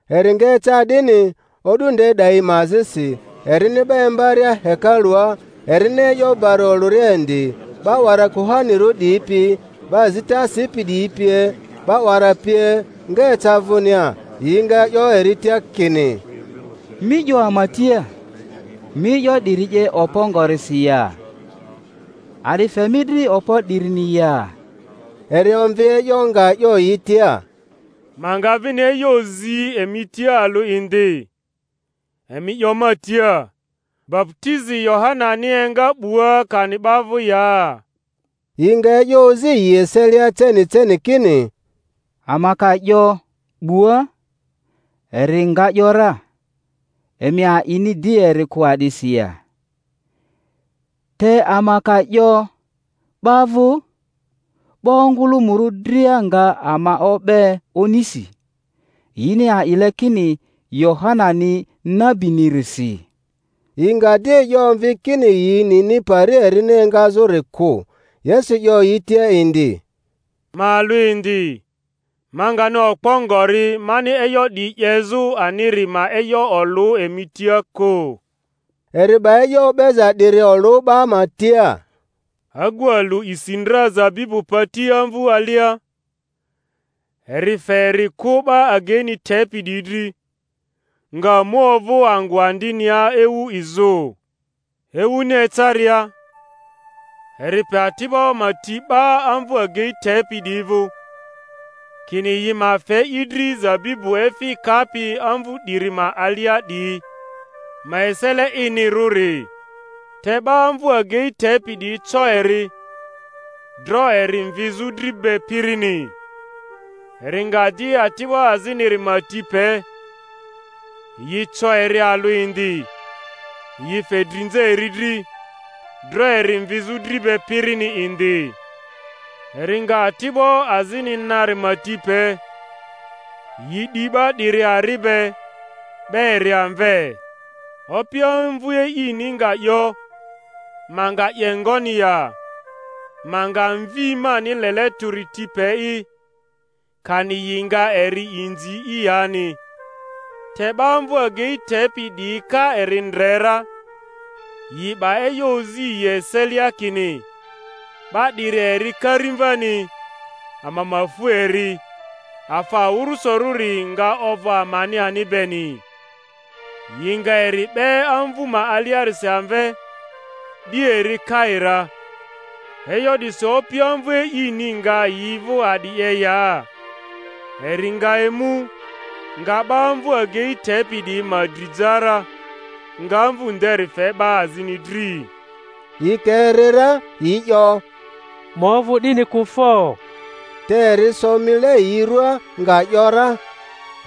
Eri nga eca 'dini, o'du nde 'dayi ma azisi, erini 'ba imbaria hekalua, erini e'yo bari olᴜria indi, 'ba 'wara kuhanirᴜ 'diyi pi, 'ba azita sipi 'diyi pie, 'ba 'wara pie nga eca vᴜnia, yi nga 'yo eri tia kini, Mi 'yo ama tia, mi e'yo 'diyi 'ye okpo ngorisi ya? A'di fe mi dri okpo 'dirini ya? Eri omvi e'yo, nga 'yo yi tia, Ma nga vini e'yo zi emi tia alᴜ indi; emi 'yo ma tia, Baputizi Yohanani enga 'bua kani 'ba vᴜ ya? Yi nga e'yo ozi yi eselia ceni ceni kini, Ama ka 'yo, 'Bua; eri nga ‘yora, Emi a'ini di eri kᴜ a'disi ya? Te ama ka 'yo, 'Ba vᴜ; 'ba ongᴜlᴜmᴜrᴜ dria nga ama o'be onisi, yini a'ile kini Yohanani nabinirisi. Yi nga di e'yo omvi kini yi nini pari erini engazᴜri kᴜ. Yesu 'yo yi tia indi, Ma alᴜ indi, ma ngani okpo ngori mani e'yo 'diyi 'yezᴜ aniri ma e'yo olᴜ emi tia kᴜ. Eri 'ba e'yo o'beza 'diri olᴜ 'ba ma tia: Agu alᴜ isi ndra zabibu pati amvᴜ alia; eri fe eri kᴜ 'ba ageini tepi 'diyi dri, nga mu ovᴜ angᴜ andinia ewu izᴜ. Ewuni ecaria, eri pe ati'bo ma ti 'ba amvᴜ agei tepi 'diyi vᴜ, kini yi ma fe i dri zabibu efi kapi amvu 'diri ma alia 'diyi ma esele inirᴜri; te 'ba amvᴜ agei tepi 'diyi co eri, dro eri mvizᴜ dri be pirini. Eri nga di ati'bo aziniri ma ti pe; yi co eri alᴜ indi, yi fe drinza eri dri, dro eri mvizᴜ dri be pirini indi. Eri nga ati'bo azini nari ma ti pe; yi di 'ba 'diri ari be, 'be eri amve. Opi amvu e'ini nga 'yo, Ma nga 'ye ngoni ya? Ma nga mvi mani lele tᴜri ti pe'i; kani yi nga eri inzi'i yani. Te 'ba amvᴜ agei tepi 'diyi ka eri ndre ra, yi 'ba e'yo ozi yi eselia, kini, 'Ba 'diri eri karimvani; ama ma fu eri, afa awᴜrᴜsorᴜri nga ovᴜ amani ani beni. Yi nga eri 'be amvu ma aliarisi amve, 'di eri kai ra. E'yo 'disi opi amvu e'ini nga yi vᴜ a'di 'ye ya? Eri nga emu, nga 'ba amvu agei tepi 'diyi ma dri ja ra, nga amvᴜ nderi fe 'ba azini dri. Yi ka eri ra, yi 'yo, Ma ovᴜ 'dini kᴜ fo! Te eri so mile yi ruaa, nga ‘yora,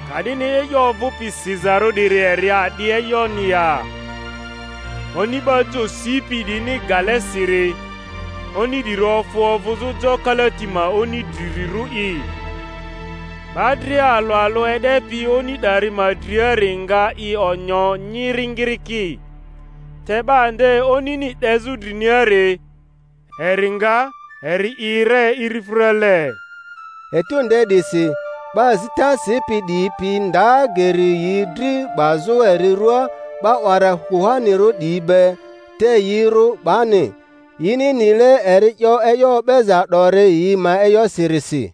Ka'dini e'yo ovᴜpi sizarᴜ 'diri eri a'di e'yoni ya: Oni ba jo sipi 'diyini gale siri, oni 'diri ofᴜ ovᴜzᴜ jo kalati ma oni drirᴜri'i. 'Ba dria alᴜ alᴜ e'depi oni 'dari ma driari nga i onyo nyiringiriki; te 'ba nde onini 'dezᴜ driniari, eri nga eri 'i, ere irifᴜrale. Etu nde 'disi 'ba azita sipi 'diyi pi nda geri yi dri 'bazᴜ eri ruaa 'ba 'wara kuhanirᴜ 'diyi be, te yi rᴜ 'bani; yini nile eri 'yo e'yo o'beza 'dori yi ma e'yosirisi.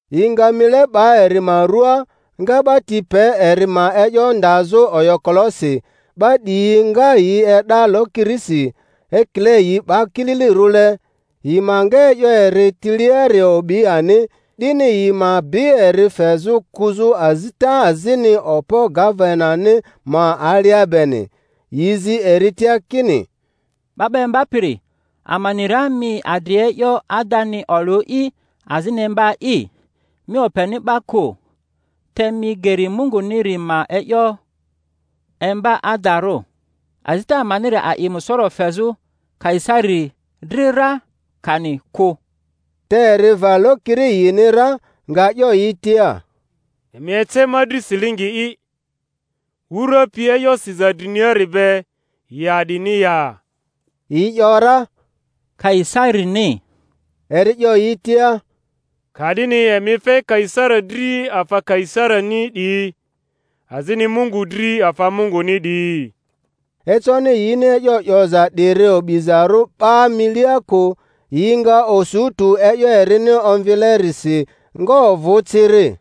Yi nga mile 'ba eri ma ruaa, nga 'ba ti pe eri ma e'yo ndazᴜ oyokolosi, 'ba 'diyi nga yi e'da lokirisi ekile yi 'ba kililirᴜle, yi ma nga e'yo eri tiliari obi ani, 'dini yi ma bi eri fezᴜ kᴜzᴜ azita azini okpo gavenani ma alia beni. Yi zi eri tia kini, 'Ba 'ba Imbapiri, ama ni ra mi adri e'yo adani olᴜ'i azini imba'i, mi openi 'ba kᴜ, te mi geri Munguniri ma e'yo imba adarᴜ. Azita amaniri a'i musoro fezᴜ Kaisari dri ra, kani kᴜ? Te eri va lokiri yini ra, nga 'yo yi tia, Emi ece ma dri silingi'i. wura pi e'yo siza driniari be, yi a'dini ya? Yi ‘yora, Kaisarini. Eri 'yo yi tia, Ka'dini emi fe Kaisari dri afa Kaisarini 'diyi, azini Mungu dri afa Munguni 'diyi. Econi yini e'yo 'yoza 'diri obizarᴜ 'ba milia kᴜ; yi nga osu tᴜ e'yo erini omvilerisi, nga ovᴜ ciri.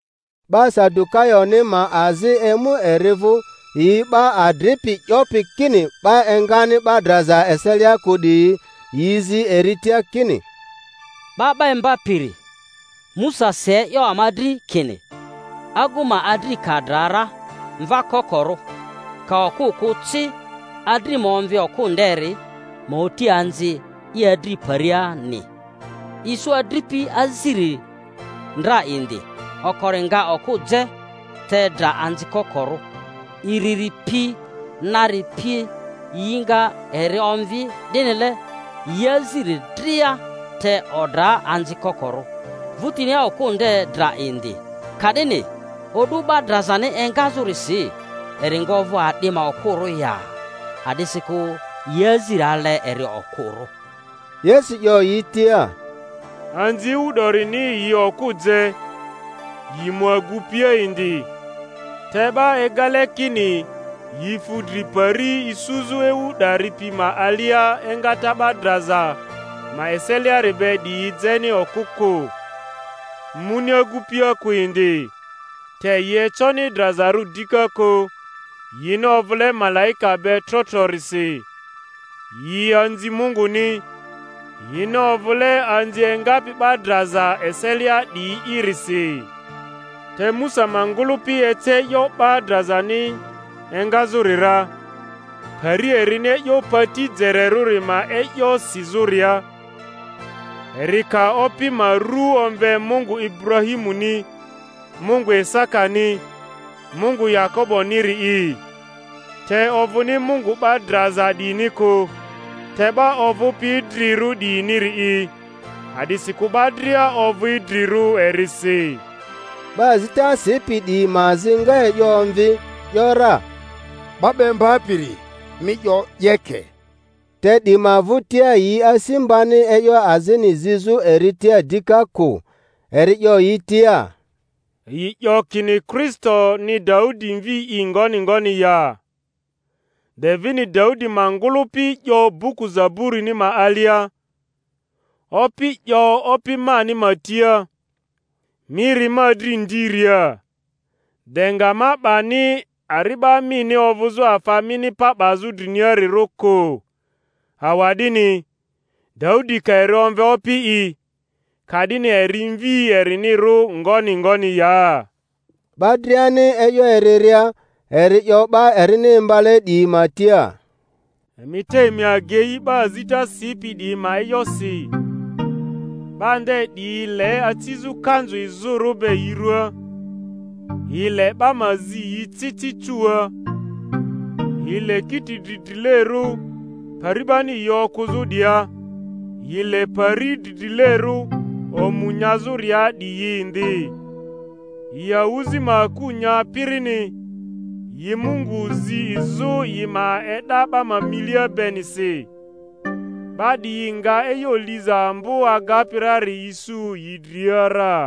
'Ba Sadukayoni ma azi emu eri vᴜ, yi 'ba adripi 'yopi kini 'ba engani 'ba draza eselia kᴜ 'diyi; yi zi eri tia kini, 'Ba 'ba Imbapiri, Musa si e'yo ama dri kini, Agu ma adri ka dra ra mva kokorᴜ, ka okᴜ kᴜ ci, adri ma omvi okᴜ nderi, ma oti anzi i adri ma pariani. Isu adripi aziri ndra indi; okori nga okᴜ je, te dra anzi kokorᴜ; iriri pi nari pie yi nga eri omvi; 'dinile yi aziri dria, te odra anzi kokorᴜ. 'vᴜtinia okᴜ nde dra indi. Ka'dini o'du 'ba drazani enga-zᴜrisi eri nga ovᴜ a'di ma okᴜrᴜ ya? A'disikᴜ yi aziri ale eri okᴜrᴜ. Yesu 'yo yi tia, Anzi ewu 'dorini yi okᴜ je, yi mu agupia indi; te 'ba egale kini yi fu dri pari isuzᴜ ewu 'dari pi ma alia engata 'ba draza ma eseliari be 'diyi jeni okᴜ kᴜ, muni agupia kᴜ indi; te yi econi drazarᴜ dika kᴜ, yini ovᴜle malaika be trotrorisi; yi anzi Munguni, yini ovᴜle anzi engapi 'ba draza eselia 'diyi'irisi. Te Musa ma ngᴜlᴜpi ece e'yo 'ba drazani engazᴜri ra, pari erini e'yo pati jererᴜri ma e'yo sizᴜria, eri ka Opi ma ru omve Mungu Iburahimuni, Mungu Isakani, Mungu Yakoboniri’i. Te ovᴜni Mungu 'ba draza 'diyini kᴜ, te 'ba ovᴜpi idrirᴜ 'diyiniri'i; a'disikᴜ 'ba dria ovᴜ idrirᴜ erisi. 'Ba azita sipi 'diyi ma azi nga e'yo omvi, ‘yora, 'Ba 'ba Imbapiri, mi 'yo 'yeke. Te 'di ma vᴜtia yi asi mbani e'yo azini zizᴜ eri tia dika kᴜ. Eri 'yo yi tia, Yi 'yo kini Kristoni Daudi mvi'i ngoni ngoni ya? De vini Daudi ma ngᴜlᴜpi 'yo buku Zaburini ma alia. Opi 'yo Opi mani ma tia, Mi ri ma dri ndiria, de nga ma 'bani ari'ba mini ovᴜzᴜ afa mi pa 'bazᴜ driniarirᴜ kᴜ. Awa'dini, Daudi ka eri omve Opi'i, ka'dini eri mvi erinirᴜ ngoni ngoni ya? 'Ba driani e'yo eriria, eri 'yo 'ba erini imbale 'diyi ma tia, Emi te emi agei 'ba azita sipi 'diyi ma e'yosi, 'ba nde 'diyi le acizᴜ kanzu izᴜrᴜ be yi ruaa, yi le 'ba ma zi yi ci ci cuua, yi le kiti dridrilerᴜ pari 'bani yi okᴜzᴜ 'diyia, yi le pari dridrilerᴜ omu nyazᴜria 'diyi indi, yi awᴜzi ma aku nya pirini, yi Mungu zi izᴜ yi ma e'da 'ba milia benisi. 'Ba 'diyi nga e'yo liza ambo agapi rari isu yi dria ra.